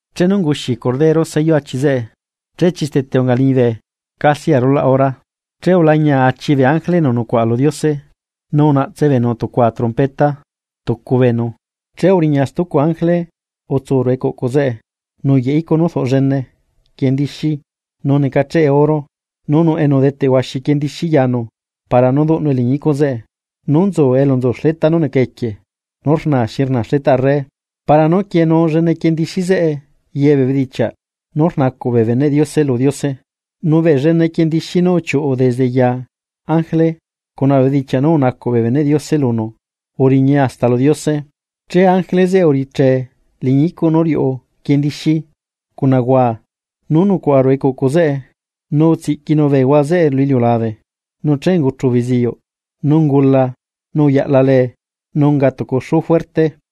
Chenu unguxi Cordero sello achi zeꞌe, che chistete unga liñibe casi arulaꞌ hora. Che ulañia achi bee ángele enu nucuaꞌa lu Diose, nu unaꞌtse beenu tucua trompeta tucu beenu. Che uriña stucu ángele utsu ruꞌu ecuꞌcu zeꞌe nuyaꞌ icuꞌ nú rduꞌ llene quiendixi nu necacheꞌe oro, che udeteꞌ tucu enu udeteꞌ huaxi quiendixi yanu para nú duꞌnue liñi icuꞌ zeꞌe, nú nzu elu nzu xleta nú neca equie nú rnaa xi rnaa xletaꞌ arre, para nú quienuu llene quiendixi zeꞌe ye bee bedichiaꞌ nú rnacuꞌ bee beneꞌ Diose lu Diose. Nu bee llene quiendixi nú uchiuꞌu desde ya ángele cuna bee bedichiaꞌ nú unacuꞌ bee beneꞌ Diose lunu, uriñae hasta lu Diose. Che ángele zeꞌe uriche liñi icuꞌ nú riuꞌu quiendixí cuna huaa nú nucuaꞌa ruꞌu ecuꞌcu zeꞌe nu utsiꞌquinu bee huaa zeꞌe lu iliulabe. Nu che unguchu beziyuꞌ, nu ungula, nu uyaꞌla lee, nu unga tucu xuu fuerte.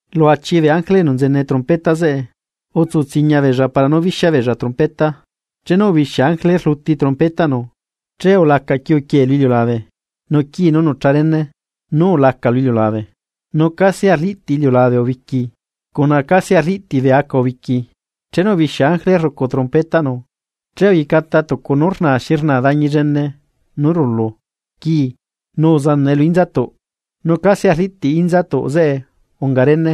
Lu achi bee ángele enu nzene trompeta zeꞌe, utsu tsiñia beella para nú bixia beella trompeta. Chenu ubixia ángele rluti trompetaꞌnu, che ulaca quiuquiee lu iliulabe nu quiie nú nucha rene, nu ulacae lu iliulabe. Nu casi arliꞌtiꞌ iliulabe ubiqui cuna casi arliꞌtiꞌ bee aca ubiqui. Chenu ubixia ángele rrucu trompetaꞌnu che uyecata tucu nú rnaa xi rnaa dañi llene nú rulue xi rulu quii nu uzanaꞌe lu inzatuꞌ nu casi arliꞌtiꞌ inzatuꞌ zeꞌe unga rene.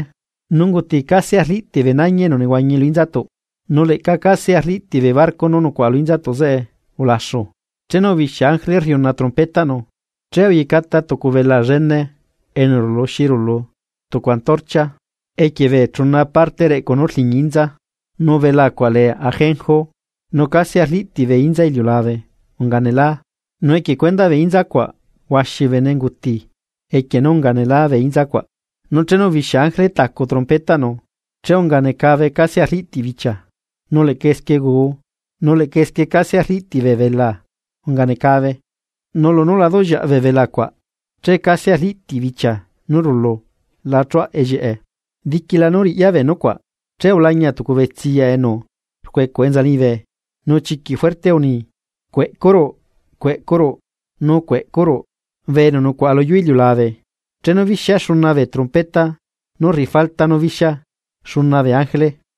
Nu unguti casi arliꞌtiꞌ bee nañi enu nehuañi lu inzatuꞌ, nu leꞌca casi arliꞌtiꞌ bee barco nú nucuaꞌa lu inzatuꞌ zeꞌe ulaxu. Chenu ubixia ángele rriuna trompetaꞌnu, che uyecata tucu belaa llene enu rulu xi rulu tucu antorchia, equie bee chuna parte reꞌcu nú rliñi inza. Nu belaa cuaꞌ lee Ajenjo; nu casi arliꞌtiꞌ bee inza iliulabe unga nelaa, nu equie cuendaꞌ bee inza cuaꞌ huaxi bee bene unguti equie nú unga nelaa bee inza cuaꞌ. Nu chenu ubixia ángele tacu trompetaꞌnu, che unga necabe casi arliꞌtiꞌ bichia, nu leꞌca esquie guu nu leꞌca esquie casi arliꞌtiꞌ bee belaa unga necabe. Nu lunú lá duꞌllieaꞌ bee belaa cuaꞌ che casi arliꞌtiꞌ bichia nú rulu lá chuaꞌa ellieꞌe. Diquila nú riꞌya bee nucuaꞌ, che ulañia tucu betsiya enu rcuecuꞌ enza liñibe: Nu chiquiꞌ fuerte unii: ―¡Cueꞌcuruꞌ, cueꞌcuruꞌ, nu cueꞌcuruꞌ! ¡Bee enu nucuaꞌa lu yuu iliulabe, chenu bixia xuna bee trompeta nú rriꞌi falta nú bixia xuna bee ángele!